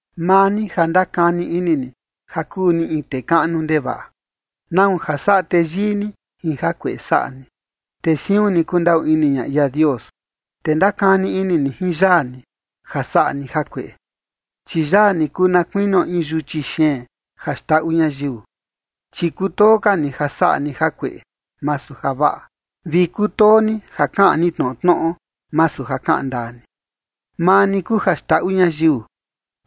Maa ni ja ndakani ini ni ja kuu ni in tee kaꞌnu ndevaꞌa, ¿nau ja saꞌa teyii ni jin jakueꞌe saꞌa ni? Te siun ni kundaꞌu ini ña ia Dios. Te ndakani ini ni jin yaa ni ja saꞌa ni jakueꞌe, chi yaa ni kuu na kuinio in yuchi xeen ja xndaꞌu ñayiu. Chi kutoo ka ni ja saꞌa ni jakueꞌe, masu javaꞌa, vi kutoo ni ja kaꞌan ni tnoꞌo tnoꞌo, masu ja kaꞌan ndaa ni. Maa ni kuu ja xndaꞌu ñayiu,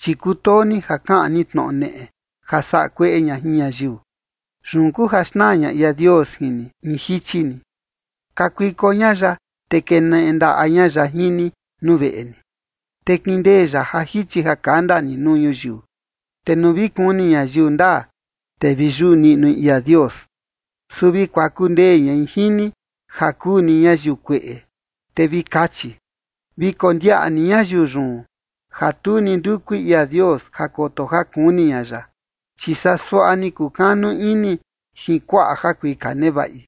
chi kutoo ni ja kaꞌan ni tnoꞌo neꞌe ja saꞌa kueꞌe ña jin ñayiu. Yun kuu ja xnaa ña ia Dios jin ni, in jichi ni. Kakuiko ña ya, te keneꞌe ndaꞌa ña ya jin ni nuu veꞌe ni, te kindee ya ja jichi ja kanda ni nuu ñuyiu. Te nuu vi kuni ñayiu ndaa, te vi yuꞌu niꞌnui ia Dios, su vi kuaku ndee ñai jin ni ja kuu ni ñayiu kueꞌe, te vi kachi: “Vi kondiaꞌa ni ñayiu yun, ja tu ni ndukui ia Dios ja koto ja kuni ña ya, chi saa suaꞌa ni kukanu ini jin kuaꞌa jakuika nevaꞌi,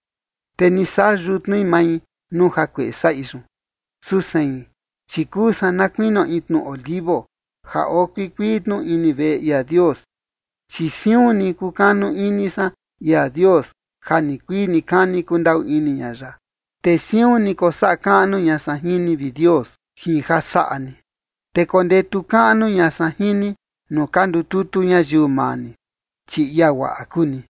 te ni saꞌa yutnui mai nuu jakueꞌe saꞌi yun”. Su sein, chi kuu san na kuinio in tnu olivo ja oo kuikuii tnu ini veꞌe ia Dios, chi siun ni kukanu ini san ia Dios ja nikuii nikani kundaꞌu ini ña ya. Te siun ni kosaꞌa kaꞌnu ña san jin ni, vi Dios, jin ja saꞌa ni, te kondetu kaꞌnu ña san jin ni nuu ka ndututu ñayiu maa ni, chi ia guaꞌa kuu ni.